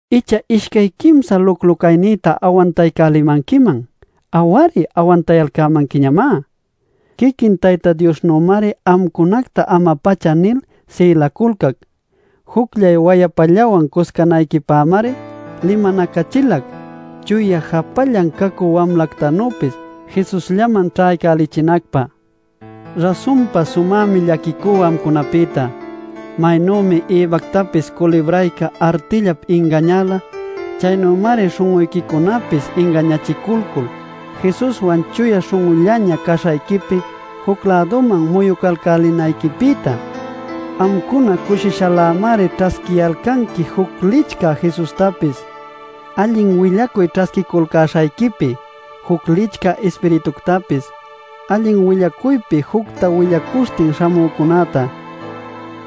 ¡Icha ishcay quimsa luclu caynïta awantaycälimanquiman! ¡Aw-ari awantayalcämanquiñamá! Quiquin Tayta Diosnümari amcunacta ama-pacha nil sïlaculcac. Jucllay wayapallawan cuscanayquipämari limanacachilac chuya japallan cacü wamlactanüpis Jesusllaman ćhaycälichinacpä. Rasunpa sumämi llaquicú amcunapïta. Maynümi Evactapis culibrayca artillap ingañäla, chaynümari śhun'uyquicunapis ingañachiculcul Jesuswan chuya śhun'ullaña caśhayquipi juc-läduman muyucalcälinayquipïta. Amcuna cushishalämari ćhasquiyalcanqui juc licchä Jesustapis, allin willacuy ćhasquiculcäśhayquipi juc licchä ispirituctapis, allin willacuypi jucta willacuśhtin śhamücunäta.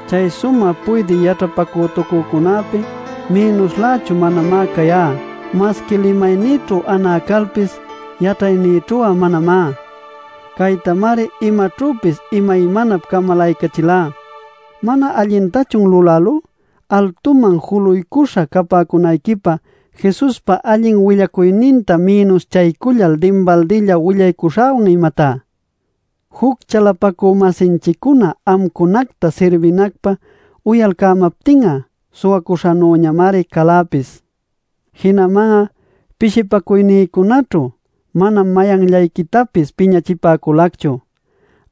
Chay sumä puydï yaćhapacütucücunäpi mïnuslächu manamá cayá. Masqui limaynïćhu anä calpis, yaćhaynïćhu'a manamá. Caytamari imaćhüpis imaymanap camalaycachilá. ¿Mana allintachun lulälú altuman juluycuśha capäcunayquipä Jesuspa allin willacuyninta mïnuschacullal dinbaldilla willaycälishäwan imatá? Juc chalapacü-masinchiccuna amcunacta sirbinacpä uyalcämaptin'a suwacüśhanüñamari caläpis. Jinaman'a pishipacuynïcunaćhu manam mayanllayquitapis piñachipäculacchu.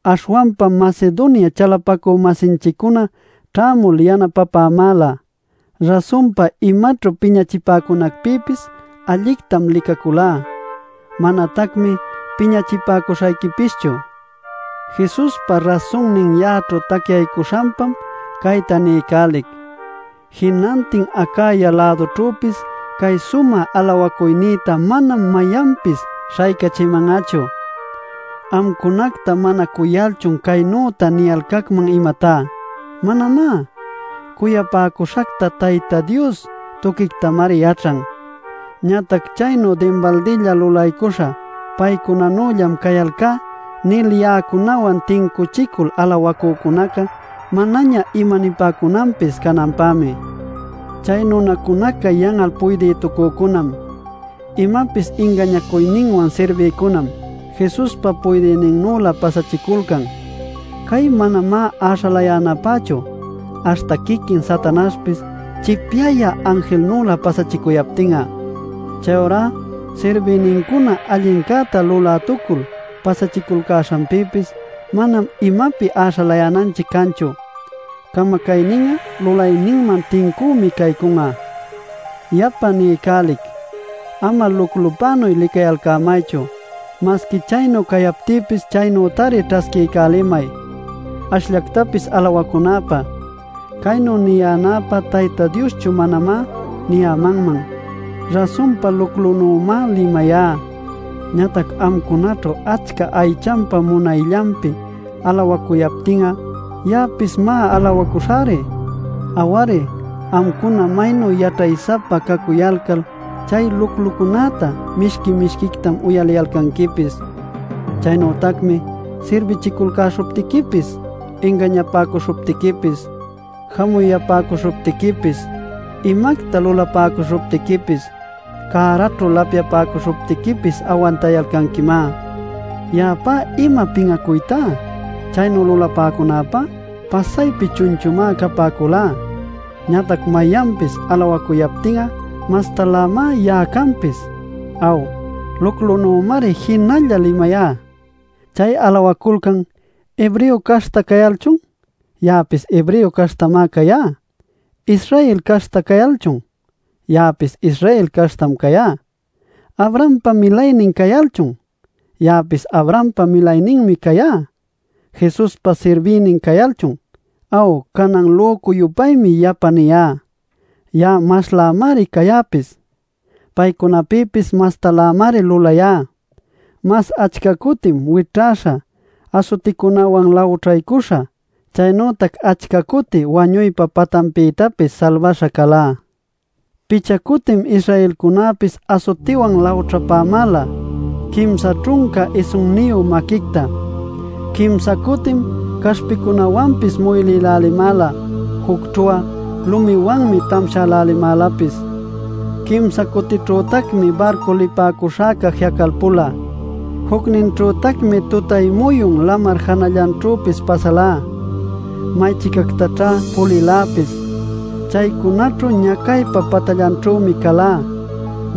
Aśhwanpam Macedonia chalapacü-masinchiccuna ćhämul yanapapämäla. Rasunpa, imaćhu piñachipäcunacpïpis allictam licaculá, manatacmi piñachipäcuśhayquipischu. Jesuspa rasunnin ya'aćhu tacyaycuśhanpam cayta niycälic: jinantin Acaya-lädućhüpis cay sumä alawacuynïta manam mayanpis śhaycachiman'achu. ¿Amcunacta mana cuyalchun caynüta niyalcacman imatá? ¡Manamá! Cuyapäcuśhacta Tayta Dios tuquictamari yaćhan. Ñatac chaynu dinbaldilla lulaycuśhä “Paycunanüllam cayalcá” nil ya'acunawan tincuchicul alawacücunaca manaña imanipäcunanpis cananpämi. Chay nunacunaca yan'al puydïtucücunam, imapis ingañacuyninwan sirbïcunam, Jesuspa puydïninnülä pasachiculcan. Cay manamá äśhalayänapächu ¡aśhta quiquin Satanaśhpis chipyayä anjilnülä pasachicuyaptin'a! Chayurá sirbïnincuna allincäta lulätucul pasachiculcäśhanpïpis manam imapi äśhalänanchic canchu. Camacaynin'a lulayninman tincümi caycun'a. Yapa niycälic: Ama luclupänuy licayalcämaychu. Masqui chaynu cayaptïpis chaynütari ćhasquiycälimay, ashllactapis alawacunäpä. Caynu niyänäpä Tayta Dioschu manamá niyämanman. Rasunpa luclunümá limayá. Ñatac amcunaćhu achca aychanpa munayllanpi alawacuyalcaptin'a ya'apis má alawacuśhäri. Aw-ari, amcuna maynu yaćhay-sapa cacuyalcal chay luclucunätá mishqui mishquictam uyaliyalcanquipis. Chaynütacmi sirbichiculcäśhuptiquipis, ingañapäcuśhuptiquipis, jamuyapäcuśhuptiquipis, imacta lulapäcuśhuptiquipis, cäraćhu lapyapäcuśhuptiquipis awantayalcanquimá. ¡Ya'apá ima pin'acuytá! ¡Chaynu lulapäcunacpá pasaypi chunchumá capäculá! Ñatac mayanpis alawacuyaptin'a mastalämá ya'a canpis. ¡Aw, luclunümari jinalla limayá! Chay alawaculcan ¿Hebreo caśhta cayalchun? Ya'apis Hebreo caśhtam cayá. ¿Israel caśhta cayalchun? Ya'apis Israel caśhtam cayá. ¿Abrahampa milaynin cayalchun? Ya'apis Abrahampa milayninmi cayá. ¿Jesuspa sirbïnin cayalchun? Aw, canan lücu-yupaymi yapa niyá - ya'a maslämari cayäpis. Paycunapïpis mastalämari lulayá; mas achca cutim wićhäśha, asuticunawan lawćhaycuśha, chaynütac achca cuti wañuypa patanpïtapis salbaśha calá. Picha cutim Israelcunäpis asutiwan lawćhapämäla quimsa ćhunca isunniyu maquicta. Quimsa cutim caśhpicunawanpis muylïlälimäla; jucćhu'a lumiwanmi tamshälälimälapis. Quimsa cutićhütacmi barcu lipäcuśhäca ji'acalpula; jucninćhütacmi tutay-muyun lamar janallanćhüpis pasalá. Maychicactaćhá puliläpis; chaycunaćhu ñacaypa patallanćhümi calá: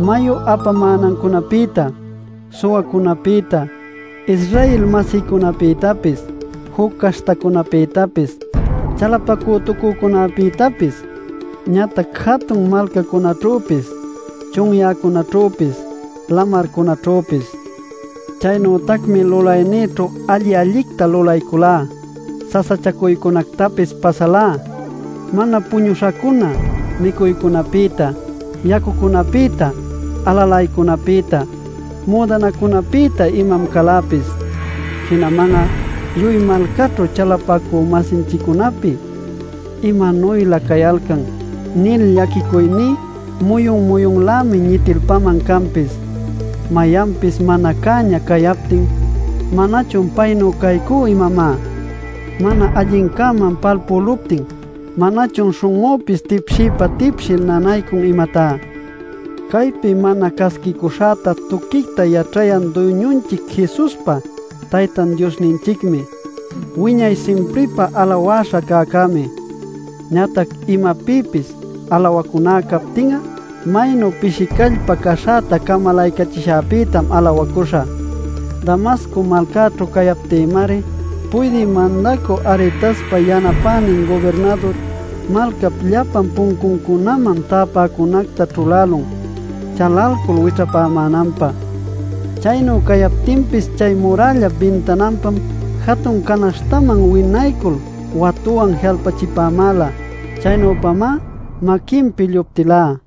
mayu apamänancunapïta, suwacunapïta, Israel-masïcunapïtapis, juc caśhtacunapïtapis, chalapacütucücunapïtapis, ñatac jatun malcacunäćhüpis, chunyäcunaćhüpis, lamarcunaćhüpis. Chaynütacmi lulaynïćhu alli-allicta lulayculá; sasachacuycunactapis pasalá; mana puñuśhacuna, micuycunapïta, yacucunapïta, alalaycunapïta, müdanacunapïta imam caläpis. Jinaman'a lluy malcaćhu chalapacü-masinchiccunapi: “¿Imanuylä cayalcan?” nil llaquicuyní muyun muyunlämi ñitilpaman canpis. Mayanpis mana cäña cayaptin ¿manachun paynuy caycú imamá? Mana allincäman palpüluptin ¿manachun śhun'üpis tipshiypa-tipshil nanaycun imatá? Caypi mana casquicuśhäta tuquicta yaćhayan Duyñunchic Jesuspa Taytan Diosninchicmi ¡wiñay simpripä alawäśha cäcämi! Ñatac imapïpis alawacuná captin'a maynu pishi callpa caśhäta camalaycachishäpïtam alawacuśhä. Damasco malcaćhu cayaptïmari Puydï Mandacü Aretaspa yanapänin gubirnadur malcap llapa puncuncunaman täpäcunacta ćhulälun chalalcul wićhapämänanpä. Chaynu cayaptinpis chay murällap bintananpam jatun canaśhtaman winaycul watuwan ji'alpachipämäla. Chaynüpamá maquinpi lluptilá.